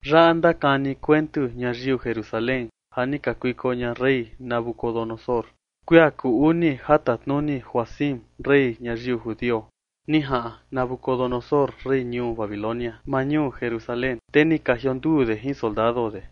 Yaꞌa ndakani kuentu ñayiu Jerusalén ja ni kakuiko ña rey Nabucodonosor, kuia kuu uni ja tatnuni Joacim, rey ñayiu judio. Ni jaꞌan Nabucodonosor, rey ñuu Babilonia, maa ñuu Jerusalén, te ni ka jionduu de jin soldado de.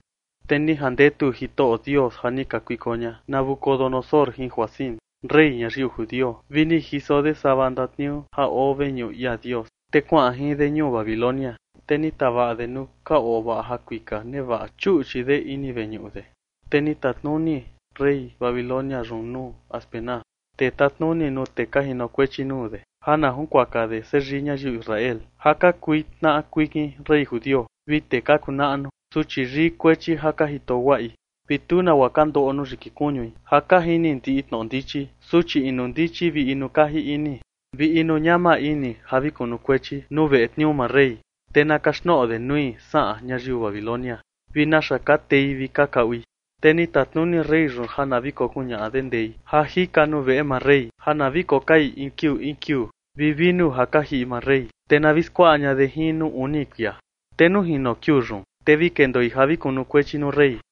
Te ni jandetu Jitoꞌo Dios ja ni kakuiko ña Nabucodonosor jin Joacim, rey ñayiu judio, vi ni jiso de sava ndatniuu ja oo veñuꞌu ia Dios, te kuaꞌan jin de ñuu Babilonia. Te ni tavaꞌa de nuu ka ovaꞌa jakuika nevaꞌa chuꞌchi de ini veñuꞌu de. Te ni tatnuni rey Babilonia yun nuu Aspenaz, tee tatnuni nuu tee ka jinokuechi nuu de, ja na junkuaka de seyii ñayiu Israel ja ka kui tnaꞌa kuikin rey judio vi tee ka kuu naꞌnu, suchi yii kuechi ja ka jito guaꞌi, vi tu nagua ka ndoꞌo nuu yiki kuñui, ja ka jini ndiꞌi tnoꞌo ndichi, suchi inu ndichi vi inu kaji ini, vi inu ñama ini ja vi kunukuechi nuu veꞌe tniuu maa rey. Te na kaxtnoꞌo de nui saꞌan ñayiu Babilonia vi naxa ka tei vi ka kaꞌui. Te ni tatnuni rey yun ja na vi kokuñaꞌa de ndei ja jika nuu veꞌe maa rey ja na vi kokai in kiuu in kiuu, vi vinu ja ka jiꞌi maa rey, te na vi skuaꞌa ña de jin nuu uni kuia. Te nuu jino kiuu yun, te vi kendoi ja vi kokunukuechi nuu rey.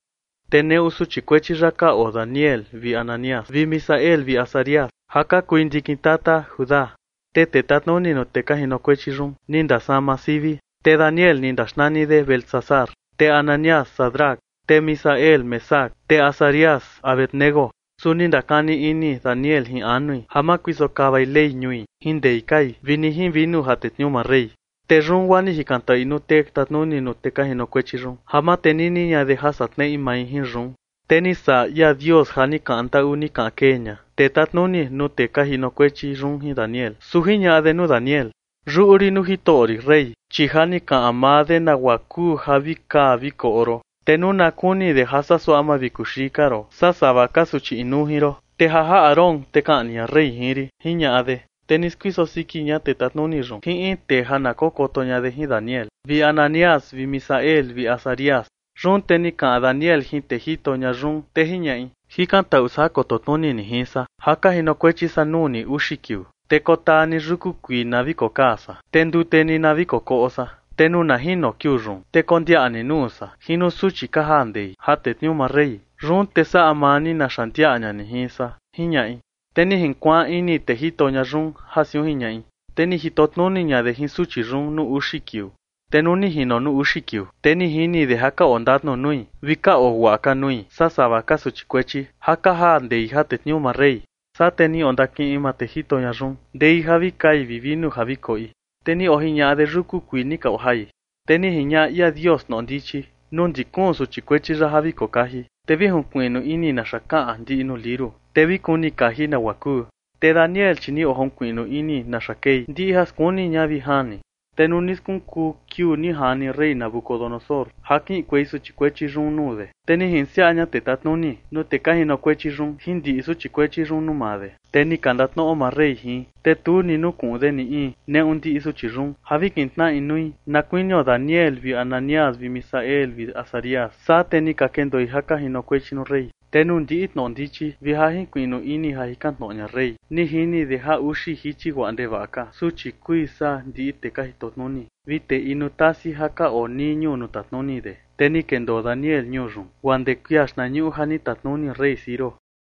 Te neꞌu suchi kuechi yaꞌa ka oo Daniel vi Ananías vi Misael vi Azarías, ja ka kui ndikin tata Judá. Te tee tatnuni nuu tee ka jinokuechi yun ni ndasama sivi, te Daniel ni ndaxnani de Beltsasar; te Ananías, Sadrac; te Misael, Mesac; te Azarías, Abed-nego. Su ni ndakani ini Daniel jin anui ja ma kuiso kavai Ley ñui jin ndei kai vi ni jin vinu ja tetniuu maa rey. Te yun guaa ni jikantaꞌui nuu tee tatnuni nuu tee ka jinokuechi yun ja ma tenini ña de ja saꞌa tneꞌi mai jin yun. Te ni saꞌa ia Dios ja ni kaꞌan ndaꞌu ni kaꞌan kee ña tee tatnuni nuu tee ka jinokuechi yun jin Daniel. Su jiñaꞌa de nuu Daniel: ―Yuꞌu rin nuu jitoꞌo rin, rey, chi ja ni kaꞌan maa de nagua kuu ja vi kaa vi koꞌo ron. Te nuu na kuni ña de ja saa suaꞌa mavikuxii ka ron saa sava ka suchi inuu jin ron, te ja jaꞌa ron, te kaꞌni ña rey jin rin ―jiñaꞌa de. Te ni skuiso siki ña tee tatnuni yun jin in tee ja na kokoto ña de jin Daniel vi Ananías vi Misael vi Azarías. Yun te ni kaꞌan Daniel jin tee jito ña yun, te jiñaꞌi: ―Jikantaꞌu san ja koto tnuni ni jin san ja ka jinokuechi san nuu ni uxi kiuu, te kotaa ni yuku kuii na vi kokaa san, te ndute ni na vi kokoꞌo san. Te nuu na jino kiuu yun, te kondiaꞌa ni nuu san jin nuu suchi ka jaa ndei ja tetniuu maa rey, yun te saꞌa maa ni naxa ndiaꞌa ña ni jin san ―jiñaꞌi. Te ni jinkuaan ini tee jito ña yun ja siun jiñaꞌi, te ni jito tnuni ña de jin suchi yun nuu uxi kiuu. Te nuu ni jino nuu uxi kiuu, te ni jini de ja ka oo ndatnu nui vi ka oo guaꞌa ka nui saa sava ka suchi kuechi ja ka jaa ndei ja tetniuu maa rey. Saa te ni ondakiꞌin maa tee jito ña yun ndei ja vi kai vi vinu ja vi koꞌi, te ni ojiñaꞌa de yuku kuii ni ka ojai. Te ni jiñaꞌa ia Dios tnoꞌo ndichi nuu ndi kuun suchi kuechi yaꞌa ja vi kokaji, te vi jinkuiꞌnu ini naxa kaꞌan ndiꞌi nuu liuru, te vi kuni kaji nagua kuu. Te Daniel, chi ni ojinkuiꞌnu ini naxa kei ndiꞌi ja skuni ña vi jani. Te nuu ni skunkuu kiuu ni jani rey Nabucodonosor ja kiꞌinkuei suchi kuechi yun nuu de, te ni jinsiaꞌa ña tee tatnuni nuu tee ka jinokuechi yun jin ndiꞌi suchi kuechi yun nuu maa de. Te ni ka ndatnoꞌo maa rey jin, te tu ni nukuꞌun de ni in neꞌu ndiꞌi suchi yun ja vi kintnaꞌa inui na kuinio Daniel vi Ananías vi Misael vi Azarías. Saa te ni ka kendoi ja ka jinokuechi nuu rey. Te nuu ndiꞌi tnoꞌo ndichi vi ja jinkuiꞌnu ini ja jikan tnoꞌo ña rey, ni jini de ja uxi jichi guaꞌa ndevaꞌa ka suchi kui saa ndiꞌi tee ka jitotnuni vi tee inu tasi ja ka oo nii ñuu nuu tatnuni de. Te ni kendoo Daniel ñuu yun guaa ndee kuia xtnañuꞌu ja ni tatnuni rey Ciro.